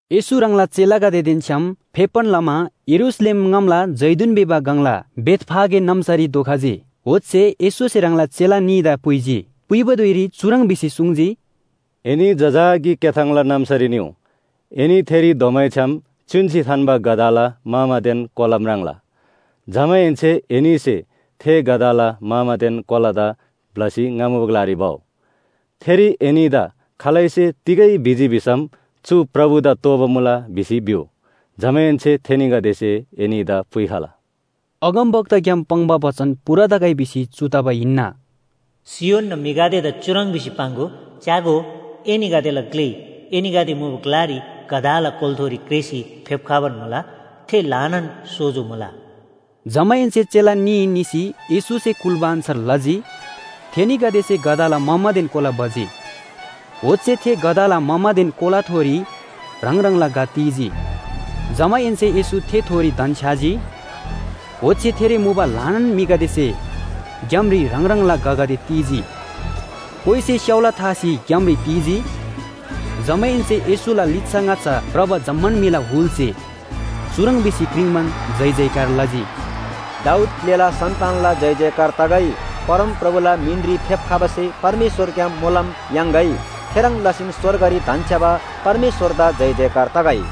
येशू ह्राङला चेलागदेदेन छ्‌याम फेप्‍बान लमा यरूशलेम ङामला जैतून भिबा गङला बेथफागे नाम्‍सारी धोखजी। ओच्‍छे येशूसे ह्राङला चेला न्‍हीदा पुइजी। पुइबा धुइरी चुह्रङ् भिसी सुङ्जी, “एनी जजाकी क्‍याथाङला नाम्‍सारी निउ। एनी थेरी धोमैछ्‌याम च्‍युन्‍सी थान्‍बा गधाला मामादेन कोला म्राङ्ला। जमाहेन्‍से एनीसे थे गधाला मामादेन कोलादा ब्‍लसी ङा मुबा ग्‍लारी भउ। थेरी एनीदा खालैसे तिगै भिजी भिसम ‘चु प्रभुदा तोःबा मुला’ भिसी भिउ। जमाहेन्‍से थेनीगदेसे एनीदा पुइखला।” अगमवक्ताग्‍याम पाङ्बा बचन पूरा तगै भिसी चु तबा हिन्‍ना। “सियोनना म्‍हिगदेदा चुह्रङ् भिसी पाङ्‍गो, ‘च्‍यागो, एनीगदेला ग्‍ले एनीगदे मुबा ग्‍लारी गधाला कोलाथोरी क्रेःसी फेप्‍खबान मुला। थे ल्‍हानान सोजो मुला।’” जमाहेन्‍से चेला न्‍ही निसी येशूसे कुल्‍बा अन्‍छार लजी। थेनीगदेसे गधाला मामादेन कोला भजी। ओच्‍छे थे गधाला मामादेन कोलाथोरी ह्राङ ह्राङला घ ती‍जी। जमाहेन्‍से येशू थेथोरी धन्‍छ्‌याजी। ओच्‍छे थेरी मुबा ल्‍हानान म्‍हिगदेसे ग्‍यामरी ह्राङ ह्राङला घगदे ती‍जी, कोइसे स्‍याउला थासी ग्‍यामरी ती‍जी, जमाहेन्‍से येशूला लिच्‍छा ङाच्‍छा भ्रबा जम्‍मान म्‍हिला हुलसे चुह्रङ् भिसी क्रिङ्बान जयजयकार लजी, “दाऊद ग्‍लेला सन्‍तानला जयजयकार तगै। परमप्रभुला मिनरी फेप्‍खबासे परमेश्‍वरग्‍याम मोलम याङ्‌गै। थेह्रङ् लसीन स्‍वर्गरी धन्‍छ्‌याबा परमेश्‍वरदा जयजयकार तगै।”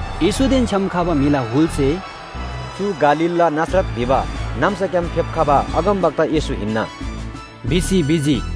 येशूदेन छ्‌याम खबा म्‍हिला हुलसे “चु गालीलला नासरत भिबा नाम्‍साग्‍याम फेप्‍खबा अगमवक्ता येशू हिन्‍ना” भिसी भिजी।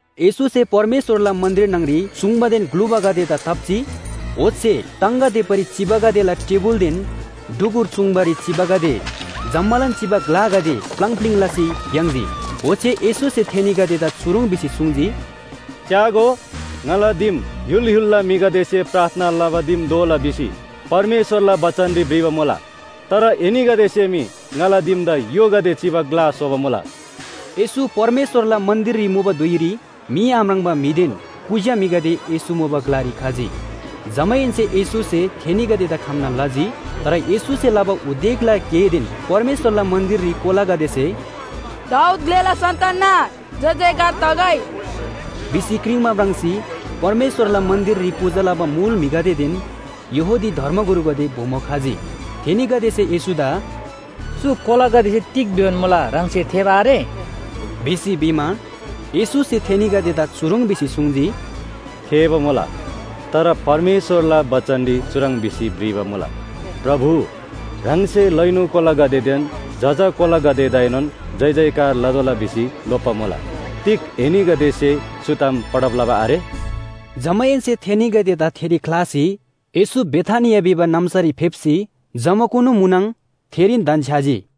येशूसे परमेश्‍वरला मन्‍दिर न्‍हङरी चूङ्बादेन ग्‍लुबागदेदा ताप्‍जी। ओच्‍छे टाङगा देप्‍बारी चिबागदेला टेबुलदेन ढुकुर चूङ्बारी चिबागदे जम्‍मालान चिबा ग्‍लागदे प्‍लाङ प्‍लिङ लसी भ्‍याङ्‍जी। ओच्‍छे येशूसे थेनीगदेदा चुह्रङ् भिसी सुङ्जी, “च्‍यागो, ‘ङाला दिम य्‍हुल य्‍हुलला म्‍हिगदेसे प्रार्थना लबा दिम दोला’ भिसी परमेश्‍वरला बचनरी भ्रिबा मुला। तर एनीगदेसे मी ङाला दिमदा य्‍होगदे चिबा ग्‍ला स्‍होबा मुला।” येशू परमेश्‍वरला मन्‍दिररी मुबा धुइरी मी आम्राङ्बा म्‍हिदेन कुज्‍या म्‍हिगदे येशू मुबा ग्‍लारी खजी। जमाहेन्‍से येशूसे थेनीगदेदा खम्‍ना लजी। तर येशूसे लबा उदेकला गेदेन परमेश्‍वरला मन्‍दिररी कोलागदेसे “दाऊद ग्‍लेला सन्‍तानना जयजयकार तगै” भिसी क्रिङ्बा म्राङ्सी परमेश्‍वरला मन्‍दिररी पूजा लबा मुल म्‍हिगदेदेन यहूदी धर्मगुरुगदे बोमो खजी। थेनीगदेसे येशूदा “चु कोलागदेसे तिग भिबान मुला ह्राङसे थेःबा आरे?” भिसी भिमा, येशूसे थेनीगदेदा चुह्रङ् भिसी सुङ्जी, “थेःबा मुला। तर परमेश्‍वरला बचनरी चुह्रङ् भिसी भ्रिबा मुला, ‘प्रभु, ह्राङसे लैनु कोलागदेदेन जजा कोलागदेदाएनोन जयजयकार लतोःला भिसी लोप्‍बा मुला’ तिग एनीगदेसे चु ताम पढब लबा आरे?” जमाहेन्‍से थेनीगदेदा थेरी ख्‍लासी येशू बेथानिया भिबा नाम्‍सारी फेप्‍सी जमाकुनु म्‍हुनङ थेरीन धन्‍छ्‌याजी।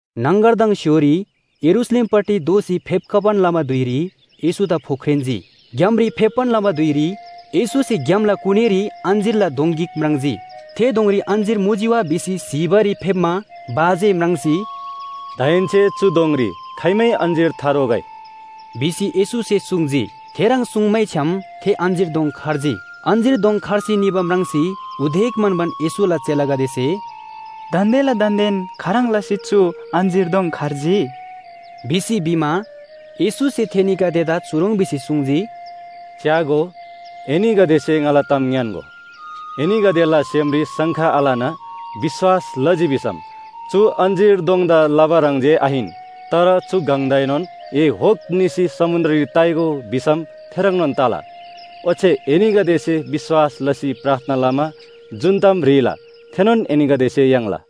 न्‍हङगरदङ स्‍य्‍होरी यरूशलेमपट्टि दोःसी फेप्‍खबान लबा धुइरी येशूदा फोख्रेन्‍जी। ग्‍यामरी फेप्‍बान लबा धुइरी येशूसे ग्‍यामला कुनीरी अञ्‍जीरला दोङ गिक म्राङ्जी। थे दोङरी अञ्‍जीर मुजी वा भिसी स्‍हीबारी फेप्‍मा भा जे म्राङ्सी “दाहेन्‍से चु दोङरी खाइमै अञ्‍जीर थारोगै” भिसी येशूसे सुङ्जी। थेह्रङ् सुङ्मैछ्‌याम थे अञ्‍जीर दोङ खर्जी। अञ्‍जीर दोङ खर्सी निबा म्राङ्सी उदेक म्‍हन्‍बान येशूला चेलागदेसे “दान्‍देला दान्‍देन खाह्रङ् लसी चु अञ्‍जीर दोङ खर्जी?” भिसी भिमा, येशूसे थेनीगदेदा चुह्रङ् भिसी सुङ्जी, “च्‍यागो, एनीगदेसे ङाला ताम ङ्‌यान्‍गो, एनीगदेला सेमरी शङ्का आलना विश्‍वास लजी भिसम चु अञ्‍जीर दोङदा लबा ह्रङ् जे आहिन, तर चु गङदाएनोन ‘ए होक निसी समुन्‍द्ररी ताइगो’ भिसम थेह्रङ्नोन तला। ओच्‍छे एनीगदेसे विश्‍वास लसी प्रार्थना लमा जुन ताम ह्रीला थेनोन एनीगदेसे याङ्ला।”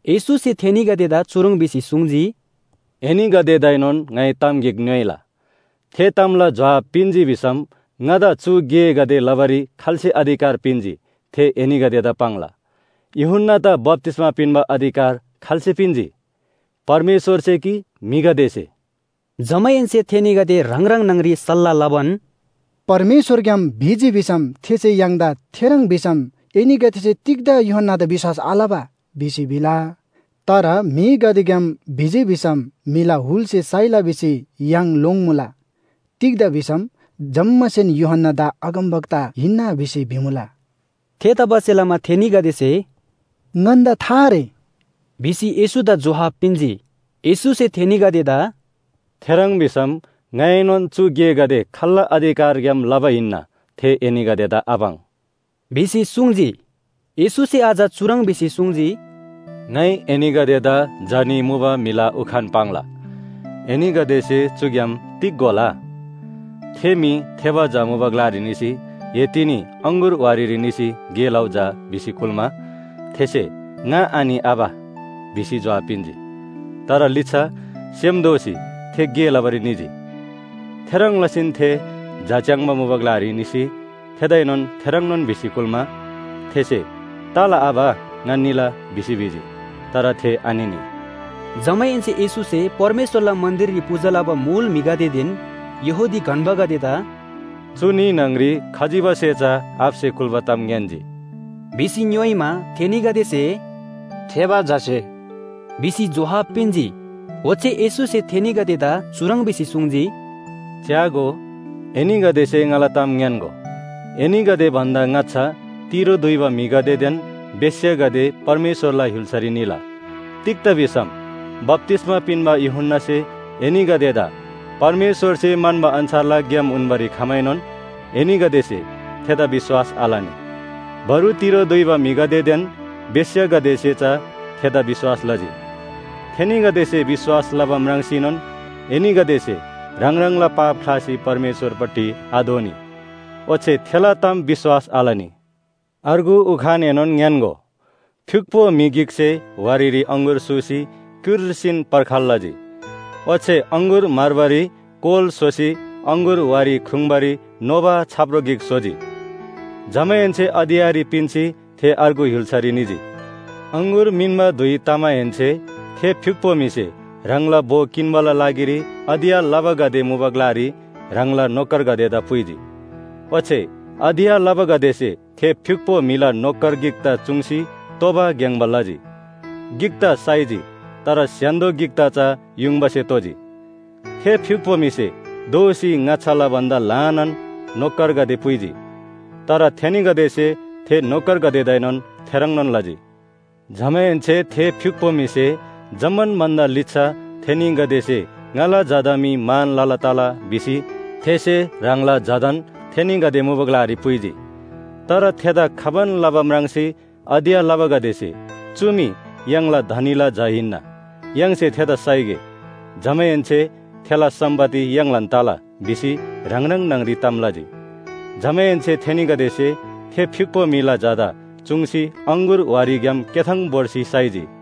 येशूसे थेनीगदेदा चुह्रङ् भिसी सुङ्जी, “एनीगदेदाएनोन ङाइ ताम गिक ङ्‌योइला। थे तामला जोहाब पिन्‍जी भिसम ङादा चु गेगदे लबारी खाल्‍से अधिकार पिन्‍जी थे एनीगदेदा पाङ्ला। यूहन्‍नादा बप्‍तिस्‍मा पिन्‍बा अधिकार खाल्‍से पिन्‍जी? परमेश्‍वरसे कि म्‍हिगदेसे?” जमाहेन्‍से थेनीगदे ह्राङ ह्राङ न्‍हङ‍री सल्‍लाह लबान, “परमेश्‍वरग्‍याम भिजी भिसम थेसे य्‍हाङदा ‘थेह्रङ् भिसम एनीगदेसे तिग्‍दा यूहन्‍नादा विश्‍वास आलबा?’ भिसी भिला। तर म्‍हिगदेग्‍याम भिजी भिसम म्‍हिला हुलसे साइला भिसी य्‍हाङ लोङ्‌मुला। तिग्‍दा भिसम जम्‍मासेन यूहन्‍नादा अगमवक्ता हिन्‍ना भिसी भिमुला।” थेतबासेलमा थेनीगदेसे “ङन्‍दा था आरे” भिसी येशूदा जोहाब पिन्‍जी। येशूसे थेनीगदेदा “थेह्रङ् भिसम ङाइएनोन चु गेगदे खाल्‍ला अधिकारग्‍याम लबा हिन्‍ना, थे एनीगदेदा आपाङ्” भिसी सुङ्जी। येशूसे अझ चुह्रङ् भिसी सुङ्जी, “ङाइ एनीगदेदा झा न्‍ही मुबा म्‍हिला उखान पाङ्ला। एनीगदेसे चुग्‍याम तिग घोला? थे म्‍हि थेबा झा मुबा ग्‍लारी निसी ‘ए तिनी अङगुर वारीरी निसी गे लउ झा’ भिसी कुल्‍मा, थेसे ‘ङा आनि आबा’ भिसी जोहाब पिन्‍जी। तर लिच्‍छा सेम दोःसी थे गे लबारी निजी। “थेह्रङ् लसीन थे झा च्‍याङ्बा मुबा ग्‍लारी निसी थेदाएनोन थेह्रङ्नोन भिसी कुल्‍मा, थेसे ‘तला आबा ङा निला’ भिसी भिजी। तर थे आनिनी।” जमाहेन्‍से येशूसे परमेश्‍वरला मन्‍दिररी पूजा लबा मुल म्‍हिगदेदेन यहूदी गन्‍बागदेदा “चु न्‍ही न्‍हङ‍री खजिबासे चा आबासे कुल्‍बा ताम ङ्‌यान्‍जी” भिसी ङ्‌योइमा, थेनीगदेसे “थेबा झासे” भिसी जोहाब पिन्‍जी। ओच्‍छे येशूसे थेनीगदेदा चुह्रङ् भिसी सुङ्जी, “च्‍यागो, एनीगदेसे ङाला ताम ङ्‌यान्‍गो, एनीगदे भन्‍दा ङाच्‍छा तिरो दुइबा म्‍हिगदेदेन बेश्‍यागदे परमेश्‍वरला य्‍हुल्‍सारी निला। तिग्‍दा भिसम बप्‍तिस्‍मा पिन्‍बा यूहन्‍नासे एनीगदेदा परमेश्‍वरसे म्‍हन्‍बा अन्‍छारला ग्‍याम उन्‍बारी खमाएनोन एनीगदेसे थेदा विश्‍वास आलनी। बरु तिरो दुइबा म्‍हिगदेदेन बेश्‍यागदेसे चा थेदा विश्‍वास लजी। थेनीगदेसे विश्‍वास लबा म्राङ्सीनोन एनीगदेसे ह्राङ ह्राङला पाप ख्‍लासी परमेश्‍वरपट्टि आदोःनी। ओच्‍छे थेला ताम विश्‍वास आलनी। “अर्गु उखानएनोन ङ्‌यान्‍गो, फ्‍युक्‍पो म्‍हि गिकसे वारीरी अङगुर सूसी क्‍युर्सीन पर्खाल लजी। ओच्‍छे अङगुर म्‍हर्बारी कोल स्‍होसी अङगुर वारी ख्रुङ्बारी नोबा छाप्रो गिक स्‍होजी। जमाहेन्‍से अधियाँरी पिन्‍सी थे अर्गु य्‍हुल्‍सारी निजी। “अङगुर मिन्‍बा धुइ तमाहेन्‍से थे फ्‍युक्‍पो म्‍हिसे ह्राङला भो किन्‍बाला लागिरी अधियाँ लबागदे मुबा ग्‍लारी ह्राङला नोकरगदेदा पुइजी। ओच्‍छे अधियाँ लबागदेसे थे फ्‍युक्‍पो म्‍हिला नोकर गिकदा चुङ्सी तोबा ग्‍याङ्‍बा लजी, गिकदा साइजी तर स्‍य्‍हान्‍दो गिकदा चा युङबासे तोजी। थे फ्‍युक्‍पो म्‍हिसे दोःसी ङाच्‍छाला भन्‍दा ल्‍हानान नोकरगदे पुइजी, तर थेनीगदेसे थे नोकरगदेदाएनोन थेह्रङ्नोन लजी। “जमाहेन्‍से थे फ्‍युक्‍पो म्‍हिसे जम्‍मान भन्‍दा लिच्‍छा ‘थेनीगदेसे ङाला झादा मी मान लला तला’ भिसी थेसे ह्राङला झादान थेनीगदे मुबा ग्‍लारी पुइजी। तर थेदा खबान लबा म्राङ्सी अधियाँ लबागदेसे ‘चु मी य्‍हाङला धनीला झा हिन्‍ना, य्‍हाङसे थेदा साइगे। जमाहेन्‍से थेला सम्‍पत्ति य्‍हाङलान तला’ भिसी ह्राङ ह्राङ न्‍हङ‍री ताम लजी। जमाहेन्‍से थेनीगदेसे थे फ्‍युक्‍पो म्‍हिला झादा चुङ्सी अङगुर वारीग्‍याम क्‍याथाङ भोर्सी साइजी।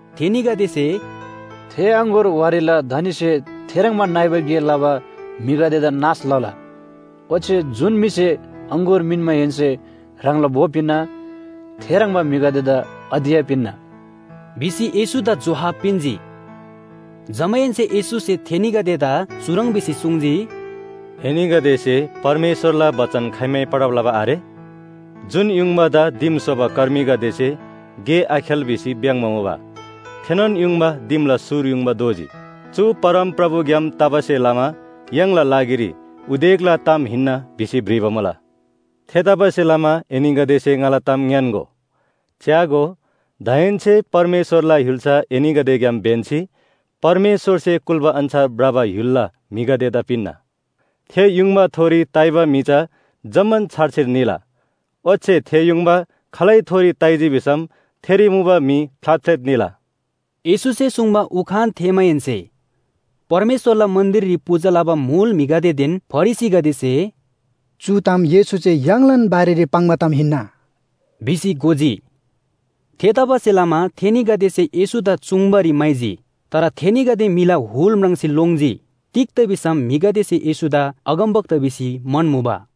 थेनीगदेसे “थे अङगुर वारीला धनीसे थेह्रङ्बा नइबा गे लबा म्‍हिगदेदा नाश लला। ओच्‍छे जुन म्‍हिसे अङगुर मिन्‍माहेन्‍से ह्राङला भो पिन्‍ना थेह्रङ्बा म्‍हिगदेदा अधियाँ पिन्‍ना” भिसी येशूदा जोहाब पिन्‍जी। जमाहेन्‍से येशूसे थेनीगदेदा चुह्रङ् भिसी सुङ्जी, “एनीगदेसे परमेश्‍वरला बचन खाइमै पढब लबा आरे? ‘जुन युङबादा दिम स्‍होबा कर्मीगदेसे गे आखेल भिसी भ्‍याङ्‍बा मुबा थेनोन युङबा दिमला सुर युङबा दोजी। चु परमप्रभुग्‍याम तबासे लमा य्‍हाङला लागिरी उदेकला ताम हिन्‍ना’ भिसी भ्रिबा मुला। “थेतबासेलमा एनीगदेसे ङाला ताम ङ्‌यान्‍गो। च्‍यागो, दाहेन्‍से परमेश्‍वरला य्‍हुल्‍सा एनीगदेग्‍याम ब्‍यन्‍सी परमेश्‍वरसे कुल्‍बा अन्‍छार भ्रबा य्‍हुलला म्‍हिगदेदा पिन्‍ना। थे युङबाथोरी ताइबा म्‍हि चा जम्‍मान छारछिर निला, ओच्‍छे थे युङबा खालैथोरी ताइजी भिसम थेरी मुबा म्‍हि फ्‍लातफ्‍लेत निला।” येशूसे सुङ्बा उखान थेःमाहेन्‍से परमेश्‍वरला मन्‍दिररी पूजा लबा मुल म्‍हिगदेदेन फरिसीगदेसे “चु ताम येशूसे य्‍हाङलान बारेरी पाङ्बा ताम हिन्‍ना” भिसी घोजी। थेतबासेलमा थेनीगदेसे येशूदा चुङ्बारी म्‍हाइजी, तर थेनीगदे म्‍हिला हुल म्राङ्सी लोङ्जी। तिग्‍दा भिसम म्‍हिगदेसे येशूदा अगमवक्ता भिसी म्‍हन्‍मुबा।